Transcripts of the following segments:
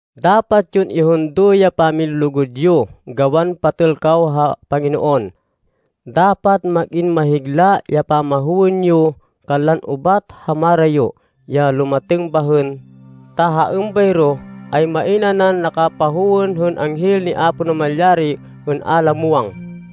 Dapat yon ihundo ya pamilulugud yo, gawan patêl kaw ha Panginoon. Dapat mag-in mahigla ya pamahowên yo kanlan ubat ha marayo, ya lumatêng bahên, ta ha êmbayro, ay main nanan nakapahowên hên anghel ni Apo Namalyari hên a la muwang.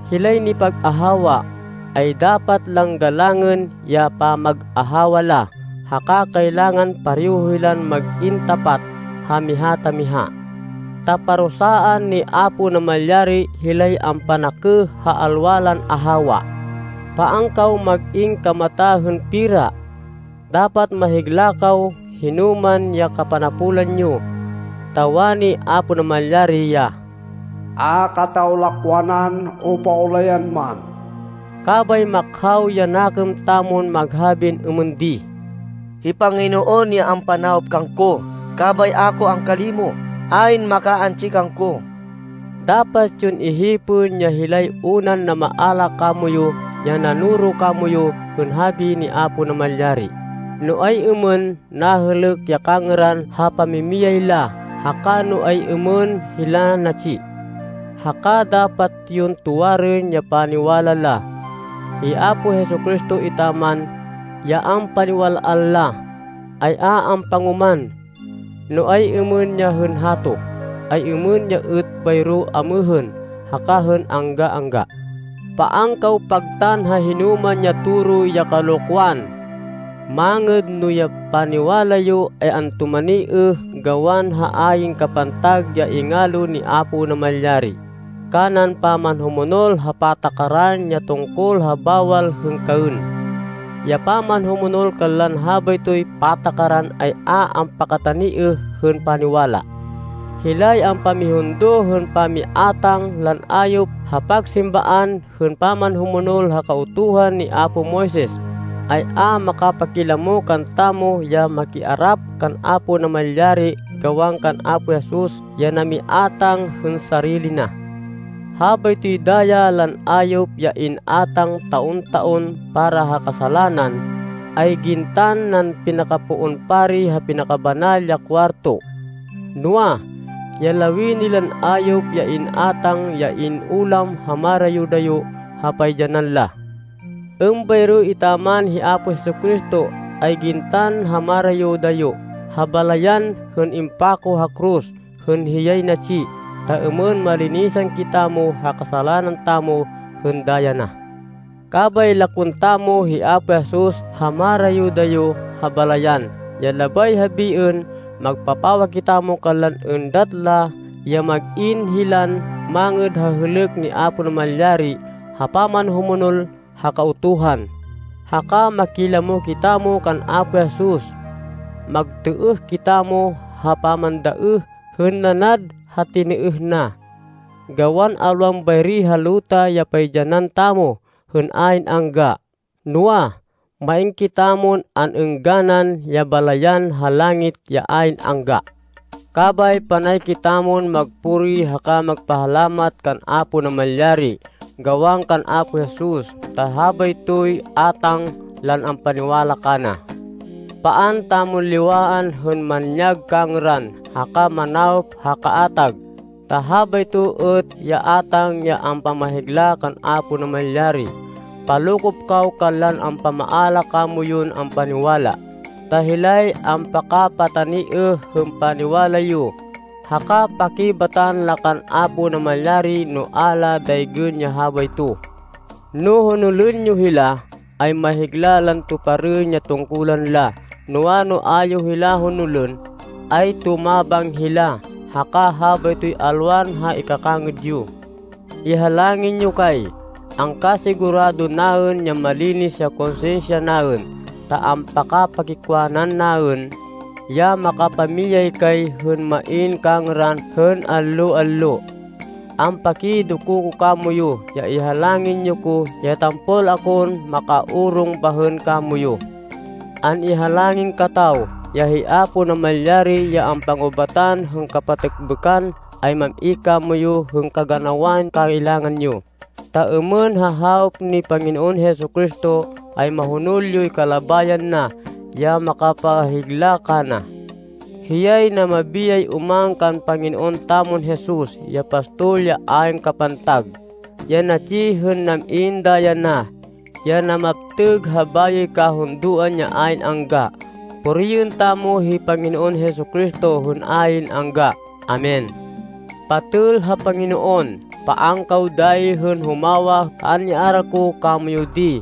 Hilay nipag-ahawa, ay dapat lan galangên ya pamag-ahawa la. Haka kailangan pareho hilan mag-in tapat ha miha ta miha. Ta parusaan ni Apo Namalyari hilay ampanakêh ha alwa lan ahawa. Paan kaw mag-in kamata hên pera. Dapat mahigla kaw hino man ya kapanapolan yo. Ta wani Apo Namalyari ya, “A kataw lakwanan o paulayan man.” Kabay makhaw ya nakêm tamon maghabin êmên di, “Hi Panginoon ya ampanawop kangko, kabay a ko angkalimo. Ayn makaantsi kangko!” Dapat yon ihipên ya hilay unan namaala kamoyu, ya nanoro kamoyu hên habi ni Apo Namalyari, no ay-êmên nahêlêk ya kangêran ha pamimiyay la, haka no ay-êmên hila natsi. Haka dapat yon tuwarên ya paniwala la. Hi Apo Jesu-Cristo etaman, ya ampaniwal-an la, ay a ampangoman. No ay-êmên ya hên hato, ay êmên ya êt bayro amêhên haka hên angga-angga. Paan kaw pagtan ha hinoman ya toro ya kalokwan. Mangêd no ya paniwala yo ay antumaniêh gawan ha ayn kapantag ya ingalo ni Apo Namalyari, kanan pamanhumonol ha patakaran ya tungkol ha bawal hên kaên. Ya pamanhumonol kanlan habaytoy patakaran ay a ampakataniêh hên paniwala. Hilay ampamihundo hên pamiátang lan ayop ha pagsimbaan hên pamanhumonol ha Kautuhan ni apo Moises, ay a makapakilamo kantamo, ya makiarap kan Apo Namalyari gawan kan Apo Jesus ya namiátang hên sarili na. Habaytoy daya lan ayop ya an-iátang taon-taon para ha kasalanan, ay gintan nan pinakapoon pari ha Pinakabanal ya Kuwarto. Noa, ya lawini lan ayop ya in-átang, ay in-ulam ha marayo-dayo ha paidyanan la. Êmbayro etaman hi Apo Jesu-Cristo, ay gintan ha marayo-dayo ha balayan hên impako ha koros, hên hiyay natsi, ta êmên malinisan kitamo ha kasalanan tamo hên daya na. Kabay lakwên tamo hi Apo Jesus ha marayo-dayo ha balayan, ya labay habiên, magpapawa kitamo kanlan êndat la ya mag-in hilan mangêd ha hêlêk ni Apo Namalyari ha pamanhumonol ha Kautuhan, haka makilamo kitamo kan Apo Jesus. Magtêêh kitamo ha pamandaêh hên nanad ha tinêêh na. Gawan alwan bayri ha luta ya paidyanan tamo hên ayn angga, noa, main kitamon an-êngganan, ya balayan ha langit ya ayn angga. Kabay panay kitamon magpuri haka magpahalamat kan Apo Namalyari gawan kan Apo Jesus, ta habaytoy átang lan ampaniwala kana. Paan tamon liwaan hên manyag kangêran haka manawop ha kaatag, ta habayto êt ya átang ya ampamahigla kan Apo Namalyari. Palokop kaw kanlan ampamaala kamoyun ampaniwala, ta hilay ampakapataniêh hên paniwala yo, haka pakibatan la kan Apo Namalyari no a la daygên ya habayto. No honolên yo hila, ay mahigla lan tuparên ya tungkulan la. Noa, no a yo hila honolên, ay tumabang hila, haka habaytoy alwan ha ikakangêd yo. Ihalangin yo kay. Angkasigurado naên ya malinis ya konsinsya naên, ta ampakapakikwanan naên, ya makapamiyay kay hên main kangêran hên allo-allo. Ampakidoko ko kamoyu ya ihalangin yo ko ya tampol akon makaorong bahên kamoyu. An-ihalangin kataw ya hi Apo Namalyari ya ampangubatan hên kapatêkbêkan ay mam-i kamoyu hên kaganawan kailangan yo, ta êmên ha hawop ni Panginoon Jesu-Cristo, ay mahonol yoy kalabayan na, ya makapahigla kana. Hiyay namabiyay oman kan Panginoon tamon Jesus, ya pastol ya ayn kapantag, ya natsi hên nam-in daya na, ya namaptêg ha bayoy kahundoan ya ayn angga. Puriên tamo hi Panginoon Jesu-Cristo hên ayn angga! Amen. Patêl ha Panginoon, paan kaw dayi hên humawa ha an-iaral ko kamoyu di,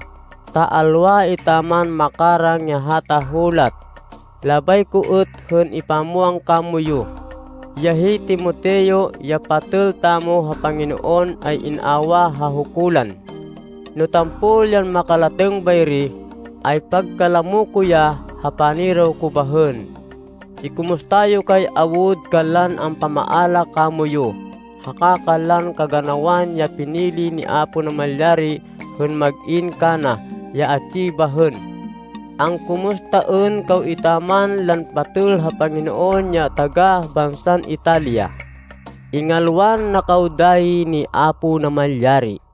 ta alwa etaman makarang ya hata hulat. Labay ko êt hên ipamwang kamoyu, ya hi Timoteo, ya patêl tamo ha Panginoon, ay in-awah ha hukulan. No tampol yan makalatêng bayri, ay pagkalamo ko ya ha paniraw ko bahên. Ikumusta yo kay awud kanlan ampamaala kamoyu, haka kanlan kaganawan ya pinili ni Apo Namalyari hên mag-in kana ya atsi bahên. Angkumustaên kaw etaman lan patêl ha Panginoon ya taga-bansan Italia. Ingalwan na kaw dayi ni Apo Namalyari.